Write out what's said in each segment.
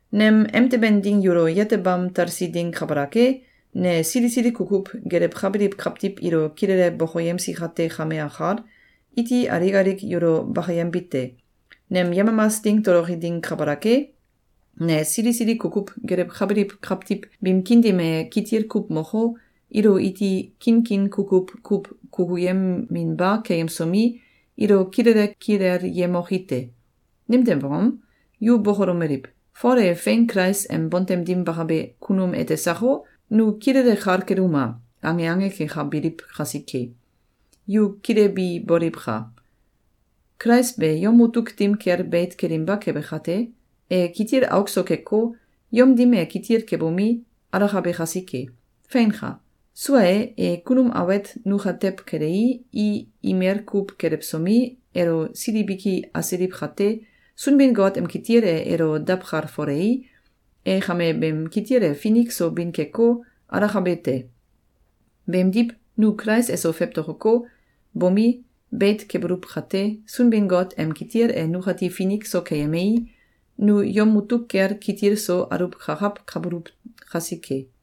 Nem emteben ding yulo yetebam talsi ding kabalak e, ne sili sili kukuw gelewkabiliw kawtiw ilo kilele bokoyemsi kate kame akal, iti alik alik yulo bakayembite: Nem yemamas ding toloki ding kabalak e, ne sili sili kukuw gelewkabiliw kawtiw biim kiin dim e kitil kuw moko, ilo iti kinkin kukuw kuw kukuyeminba keyemsomi, ilo kilele kilelyemoki te. Nimtew angom? Yu bokolomeliw: “Fol e fein Kulais em bontem dim bakabe kunum ete sako? Nu kilele kal keluma!”, ange ange kekabiliw kasike. Yu kilebi boliwka! Kulais be yom mutuk dim kel beit kelinba kebe kate, e kitil auk so keko, yom dim e kitil kebomi, alakabe kasike. Feinka! Sua e, e kunum awet nukatew kelei, i imel kuw kelewsomi, elo sil biki asiliw kate, Sunbin-Got em kitil e elo dawkalfolei, e kame beem kitil e finik so bin keko, alakabe te. Beemdiw, nu Kulais eso fewtokoko, bomi, beit kebuluw kate, Sunbin-Got em kitil e nukati finik so keyemei, nu yom mutuk kel kitil so aluwkakawkabuluw kasike.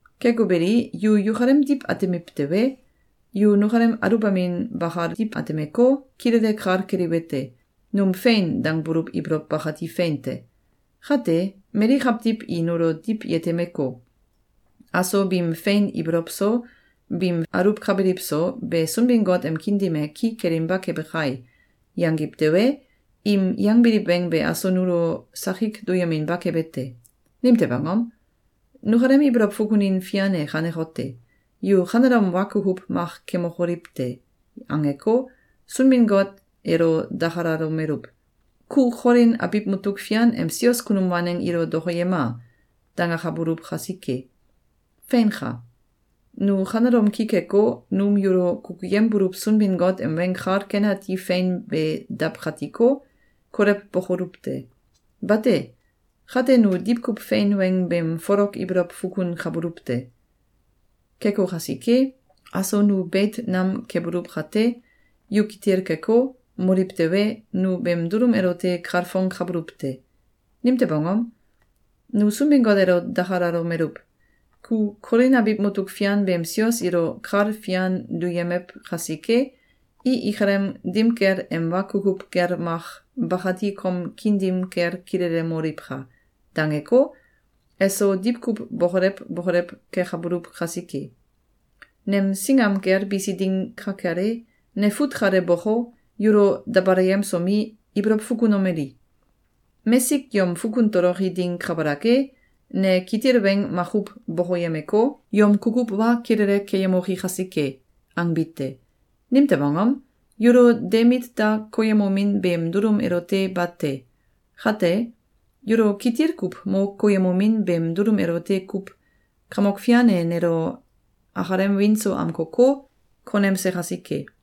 Keko beli, yu yukalem diw atemiw tewe, yu nukalem aluwbamin bakal diw atemeko, kilele kal keliwete: Num “Fein!”, dangbuluw ibolow bakati fein te. Kate, mali kawtiw i nulo diw yetemeko, “Aso biim fein ibolow so, biim aluwkabiliw so be Sunbin-Got em kiin dim e ki kelinba kebe kai!”, yangiw tewe, im yangbiliw weng be aso nulo sakik duyeminba kebe te. Nimtew angom? Nukalem ibolow fukunin fian e kanekote: “Yu kanelom wa kukuw mak kemokoliw te!”, angeko, Sunbin-Got elo dakalomeluw: “Ku Kolin abiw mutuk fian em sios kunum waneng ilo dokoyema!”, dangakabuluw kasike. Feinka! Nu kanelom ki keko, num yulo kukuyembuluw Sunbin-Got em Weng Kal Ken Ati fein be dawkatiko, kolewbokoluw te! Bate. Kate, nu diwkuw fein weng beem folok ibolow fukunkabuluw te. Keko kasike, aso nu beit nam kebuluw kate, yu kitil keko, moliw tewe, nu beem dulum elote kalfongkabuluw te. Nimtew angom? Nu Sunbin-Got elo dakalalomeluw: “Ku Kolin abiw mutuk fian beem sios ilo kal fian duyemew kasike, i ikalem dim kel em wa kukuw gel mak bakati kom kiin dim kel kilelemoliwka!”, dangeko, eso diwkuw bokolew bokolew kekabuluw kasike. Nem singam kel bisi ding ka kel e, ne fut kale boko, yulo dabalayemsomi, ibolow fukunomeli: “Mesik yom fukun toloki ding kabalak e, ne kitil weng makuw bokoyemeko, yom kukuw wa kilele keyemoki kasike!”, angbi te. Nimtew angom? Yulo de mit da koyemomin beem dulum elote bate. Kate, yulo kitil kuw mo koyemomin beem dulum elote kuw Kamok Fian e nelo akalem wiin so amkoko, konemse kasike.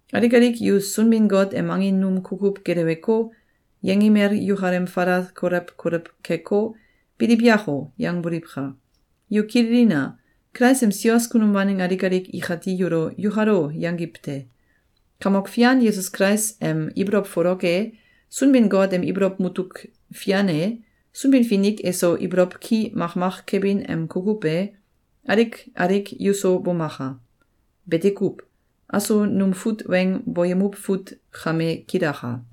Alik alik yu Sunbin-Got em angin num kukuw geleweko, yengimel yukalem falal kolew kolew keko, “Biliw yako!”, yangboliwka! Yu kililina! Kulais em sios kunum waneng alik alik ikati yulo “Yukalo!”, yangiw te. Kamok Fian Yesus Kulais em ibolow folok e, Sunbin-Got em ibolow mutuk fian e, Sunbin-Finik eso ibolow ki makmak kebin em kukuw e, alik alik yuso bomaka! Bete kuw. Aso num fut weng boyemuw fut kame kilaka.